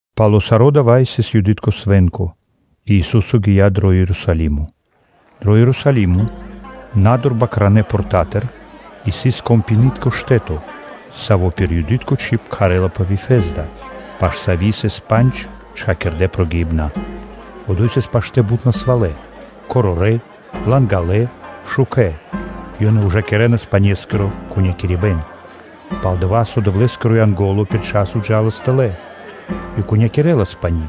Пало́ саро́ дава́ сыс Юды́тко свэ́нко, и Ису́со гия́ дро Ерусалимо. Дро Ерусалимо, на́дур Бакритконэ портатыр, сыс вэндэри (прудо), саво́ пир Юды́тко чиб кхарэ́лапэ “Вифезда”, паш сави́ сыс трэ́мо (коридоро) панджинэ прогиибнэнца. Одо́й сыс паштэ́ бут насвалэ: корорэ́, лангалэ, шукэ́, /ёнэ ужакирэнас панескиро кунипэн/. Пал-дова́ со Дэвлэ́скиро Янго́ло пир дова́-паць часо джа́лас тэлэ́ и кунякирэлас пани́,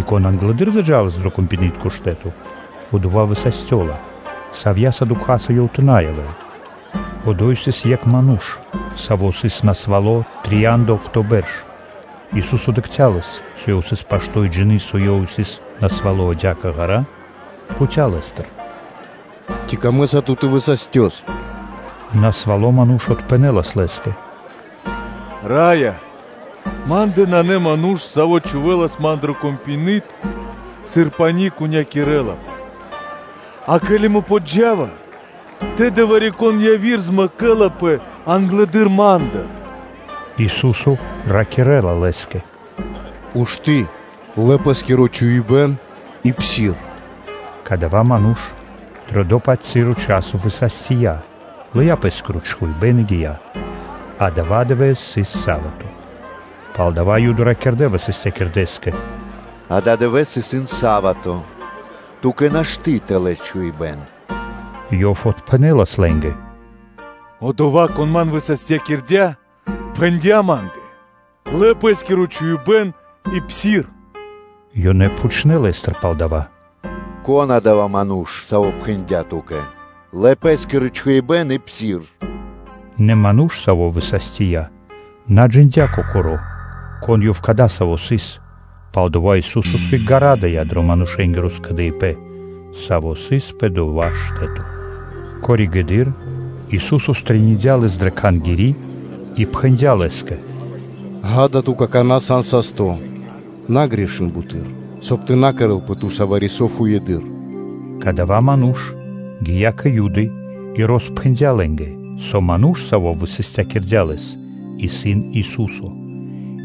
и кон англэды́р заджалас дрэ вэндэри́н (прудо), одова́ высастёла, савья́са дукхаса ёв тэ на явэ́л. Одо́й сыс екх ману́ш, саво́ сыс насвало́ трияндаохто бэрш. Ису́со дыкхця́ лэс, со ёв сыс пашто́ и джины́, со ёв исын насвало́ адя́кэ ґара́ (длу́гэс), пхуця́ лэ́стыр: “Ци камэ́са ту тэ высастёс?” Насвало ману́ш отпхэнэ́лас Лэ́скэ: “Раё! Ма́ндэ нанэ ману́ш, саво́ чхувэлас ман дрэ вэндэри́н, сыр пани́ кунякирэлапэ; а ке́ли мэ ява́ва пашылэды́р, тэды вари-кон яви́р змэкэлапэ англэды́р ма́ндыр.” Ису́со ракирэ́ла лэ́скэ: “Ушты́, лэ пэ́скиро чхуибэ́н и псир.” Кадава́ ману́ш дрэ дава́-паць моменто высастия, лыя́ пэ́скиро чхуибэ́н и гия́. Адава́ дывэ́с сыс са́вато (субо́та). Палдава́ Юды ракирдэ́ высастякирдэскэ: “Ададывэ́с исын са́вато; ту́кэ нашты́ тэ лэс чхуибэ́н.” Ёв отпхэнэ́лас лэ́нгэ: “Одова́, Кон ман высастякирдя́, пхэндя́ ма́нгэ: ‘Лэ пэ́скиро чхуибэ́н и псир’” Ёнэ пхучнэ́ Лэ́стыр палдава́: “Кон исын Одова́ Ману́ш, Саво́ пхэндя́ ту́кэ: ‘Лэ пэ́скиро чхуибэ́н и псир?’” Нэ ману́ш, саво́ высастия, на джиндя́ кокоро́, кон Ёв адасаво́ сыс, пал-дова́ со Ису́со сыг гарадыя дро манушэ́нгиро скэдыибэ́н, саво́ сыс пэ дова́ штэ́то. Коригэды́р (позжэ) Ису́со стрэниндя лэс дрэ Кхангири́ и пхэндя́ лэ́скэ: “Ѓа́да, ту какана́ сан састо́: на грешын буты́р, соб (кай) тэ на кэрэ́лпэ ту́са вари-со фуеды́р.” Кадава́ ману́ш гия́ кэ Юды и роспхэндя́ лэ́нгэ, со ману́ш, Саво́ высастякирдя́ лэс, исын Ису́со.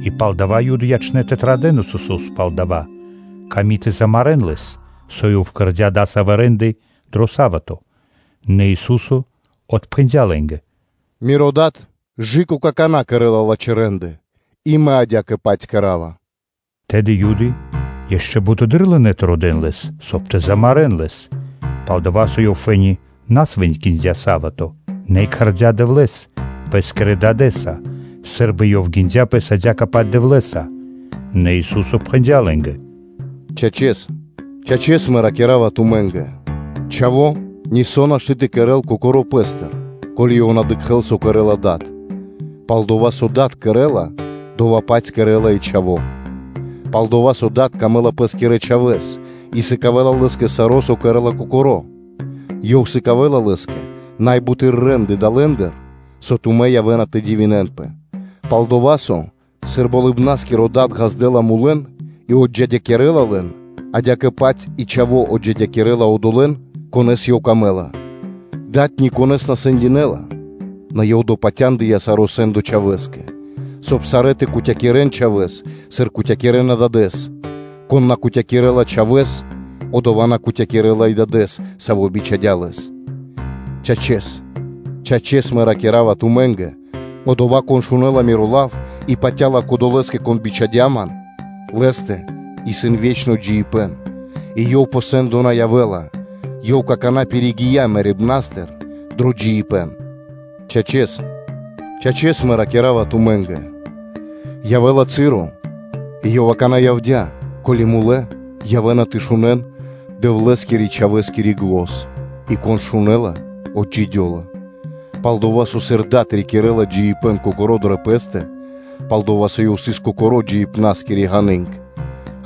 И палдава́ Юды ячнэ́ тэ традэ́н Исусо́с пал дова́, ками́ тэ замарэ́н Лэс, со Ёв кэрдя́ дасавэ́ рэ́нды (де́лы) дро са́вато. Нэ Ису́со отпхэндя́ лэ́нгэ: “Миро Дад кэ какана́ кэрэ́ла лачхэ́ рэ́нды и Мэ адя́кэ-паць кэра́ва.” Тэды Юды ишчо (инкэ́) бутэды́р лынэ́ тэ родэ́н Лэс, соб (кай) тэ замарэ́н Лэс, пал-дова́, со Ёв фэ́ни на свэнкиндя са́вато, нэ и кхардя́ Дэвлэ́с Пэ́скирэ Дадэ́са, сы́рбы Ёв гиндя Пэс адя́кэ-паць Дэвлэ́са. Нэ Ису́со пхэндя́ лэ́нгэ: “Чачэс, чачэс, Мэ ракира́ва тумэ́нгэ: Чхаво́ нисо́ нашты́ тэ кэрэ́л Кокоро́ Пэ́стыр, ко́ли Ёв тэ на дыкхэ́л, со кэрэ́ла Дад, пал-дова́ со дова́, со Дад кэрэ́ла, дова́-паць кэрэ́ла и Чхаво́. Пал-дова́ со Дадэ́скэ исын дро́го Лэ́скиро Чхаво́ и Ёв сыкавэ́ла Лэ́скэ саро́, со кэрэ́ла Кокоро́; Ёв сыкавэ́ла Лэ́скэ най буты́р рэ́нды далэндыр, со тумэ́ явэ́на тэ дивинэнпэ. Пал-дова́ со, сыр Болыбна́скиро Дад ґаздэ́ла мулэн и отджидякирэла лэн, адя́кэ-паць и Чхаво́ отджидякирэла одолэ́н, конэ́с исын Лэ́скэ пир ило́. Дад никонэ́с на сэндинэла, нэ Ёв допатяндыя саро́ сэ́ндо Чхавэ́скэ; соб (кай) сарэ́ тэ кутякирэн Чхавэ́с, сыр кутякирэна Дадэ́с. Кон на кутякирэла Чхавэ́с, одова́ на кутякирэла и Дадэ́с, Саво́ бичхадя́ Лэс. Чачэс, чачэс Мэ ракира́ва тумэ́нгэ: одова́, кон шунэ́ла Миро Лав и патя́ла Кодолэ́скэ, Кон бичхадя́ Ман, лэ́стэ исын ве́чно джиибэ́н и ёв пэ сэ́ндо на явэ́ла, ёв какана́ пиригия мэрибна́стыр дро джиибэ́н. Чачэс, чачэс Мэ ракира́ва тумэ́нгэ: явэ́ла часо и ёв акана́ явдя́, ко́ли мулэ́ явэ́на тэ шунэ́н Дэвлэ́скирэ-Чхавэскири зан (глос), и, кон шунэ́ла, отджидёла. Пал-дова́ со, сыр Дад рикирэ́ла джиибэ́н Кокоро́ дрэ Пэ́стэ, пал-дова́ со Ёв сыс Кокоро́ джиибна́скири ґаны́нг,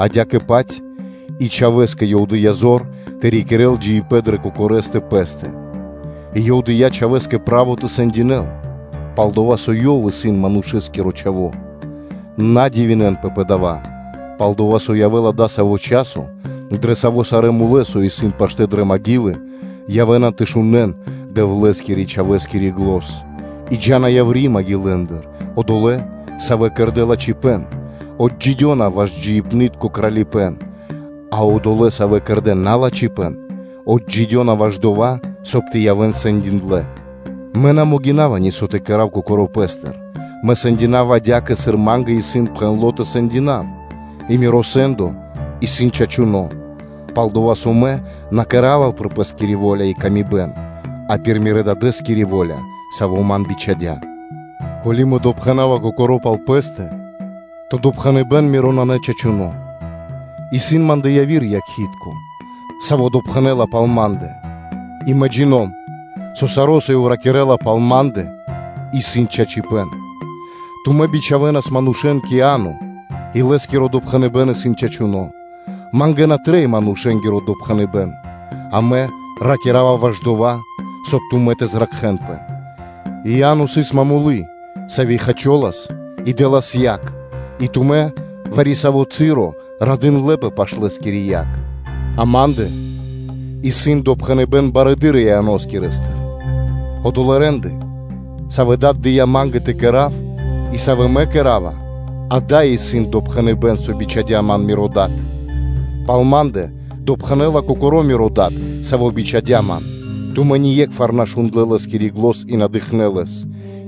адя́кэ-паць и Чхавэ́скэ Ёв дыя́ зор тэ рикирэ́л джиибэ́н дрэ Кокорэстэ Пэ́стэ; и Ёв дыя́ Чхавэ́скэ право тэ сэндинэл, пал-дова́ со Ёв исын Манушэ́скиро Чхаво́. На дивинэнпэ пэ дава́, пал-дова́ со явэ́ла дасаво часо, дрэ саво́ сарэ́ мулэ́, явэ́на тэ шунэ́н Дэвлэ́скирэ-Чхавэскири зан; и джа́на яври́ маґилэндыр (кулэ́ндыр): одолэ́, савэ́ кэрдэ́ лачхипэ́н, отджидёна-ваш джиибнытко Кралипэ́н; а одолэ́, савэ́ кэрдэ́ налачхипэн, отджидёна ваш дова́, соб (кай) тэ явэ́н сэндиндлэ. Мэ нашты́ (на могина́ва) нисо́ тэ кэра́в Кокоро́ Пэ́стыр, Мэ сэндинава адя́кэ, сыр Ма́нгэ исын пхэндло́ тэ сэндинав, и Миро сэ́ндо исын чачуно́, пал-дова́ со Мэ на кэра́ва пир Пэ́скири во́ля, а пир Мирэ́-Дадэ́скири во́ля, Саво́ Ман бичхадя́. Ко́ли Мэ допхэнава Кокоро́ пал Пэ́стэ, то допхэныбэ́н Миро исын на чачуно́. Исын Ма́ндэ яви́р якхи́тко (свидетелё), саво́ допхэнэ́ла пал Ма́ндэ, и Мэ джино́м, со саро́, со Ёв ракирэ́ла пал Ма́ндэ, исын чачипэ́н. Тумэ́ бичхавэнас манушэ́н кэ Иа́но и лэ́скиро допхэныбэ́н исын чачуно́. Ма́нгэ на трэй манушэ́нгиро допхэныбэ́н, а Мэ ракира́ва ваш дова́, соб (кай) тумэ́ тэ зракхэнпэ. Иа́но сыс момолы́тко (свети́льнико), саво́ хачолас и дэ́лас яг и тумэ́ вари-саво́ часо радындлэпэ паш лэ́скири яг. А Ма́ндэ исын допхэныбэ́н барэды́р Ианоскирэстыр; одолэ́ рэ́нды, савэ́ Дад дыя́ Ма́нгэ тэ кэра́в, и савэ́ Мэ кэра́ва, дава́ исын допхэныбэ́н, со бичхадя́ Ман Миро Дад. Пал Ма́ндэ допхэнэ́ла Кокоро́ Миро Дад, Саво́ бичхадя́ Ман, тумэ́ ние́кхвар на шундлэ́ Лэ́скири зан, и на дыкхнэ́ Лэс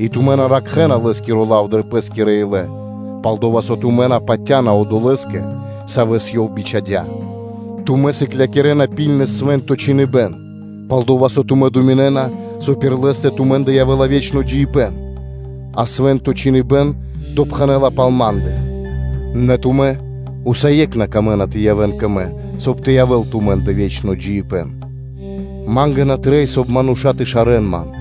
И тумэ́ на ракхэна Лэ́скиро лав дрэ пэ́скирэ илэ, палдова́ со тумэ́ на патя́на Одолэ́скэ, Савэс Ёв бичхадя́. Тумэ́ сыклякирэ́на миштэ́с Свэ́нто Чхиныбэ́н, пал-дова́ со тумэ́ дэна годы пэскэ думинэ́на, со пир лэ́стэ тумэ́ндэ явэ́ла ве́чно джиибэ́н; а Свэ́нто Чхиныбэ́н допхэнэ́ла пал Ма́ндэ, нэ тумэ́ усае́кх на камэ́на тэ явэ́н кэ Мэ, соб (кай) тэ явэ́л тумэ́ндэ ве́чно джиибэ́н. Ма́нгэ на трэй, соб (кай) мануша́ тэ шарэ́н Ман.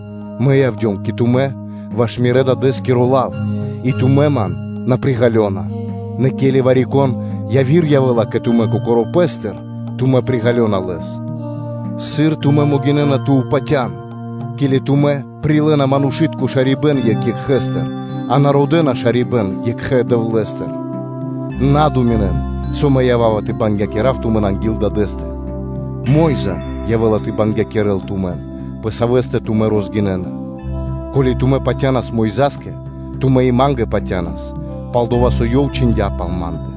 Мэ явдём кэ тумэ́ ваш Мирэ́-Дадэ́скиро лав, и тумэ́ Ман на приґалёна, нэ ке́ли вари-кон яви́р явэ́ла кэ тумэ́ кокоро́ пэ́стыр, тумэ́ приґалёнас лэс. Сыр тумэ́ могинэ́на тэ упатян, ке́ли тумэ́ прилэ́на манушы́тко шарибэ́н екх екхэстыр, а на родэ́на шарибэ́н екхэ Дэвлэ́стыр? На́ дэн годы́ пэ́скэ (на́ думинэн), со Мэ ява́ва тэ бангякирав тумэн анги́л Дадэ́стэ: Мо́йза явэ́ла тэ бангякирэл тумэн, пэ савэ́стэ тумэ́ розгинэна. Ко́ли тумэ́ патянас Мойза́скэ, тумэ́ и Ма́нгэ патянас, пал-дова́ со ёв чхиндя́ пал Ма́ндэ.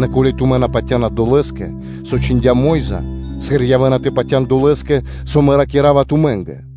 Нэ сыр тумэ́ на патя́на долэ́скэ, со чхиндя́ Мо́йза, сыр явэ́на тэ патя́н долэ́скэ, со Мэ ракира́ва тумэ́нгэ?”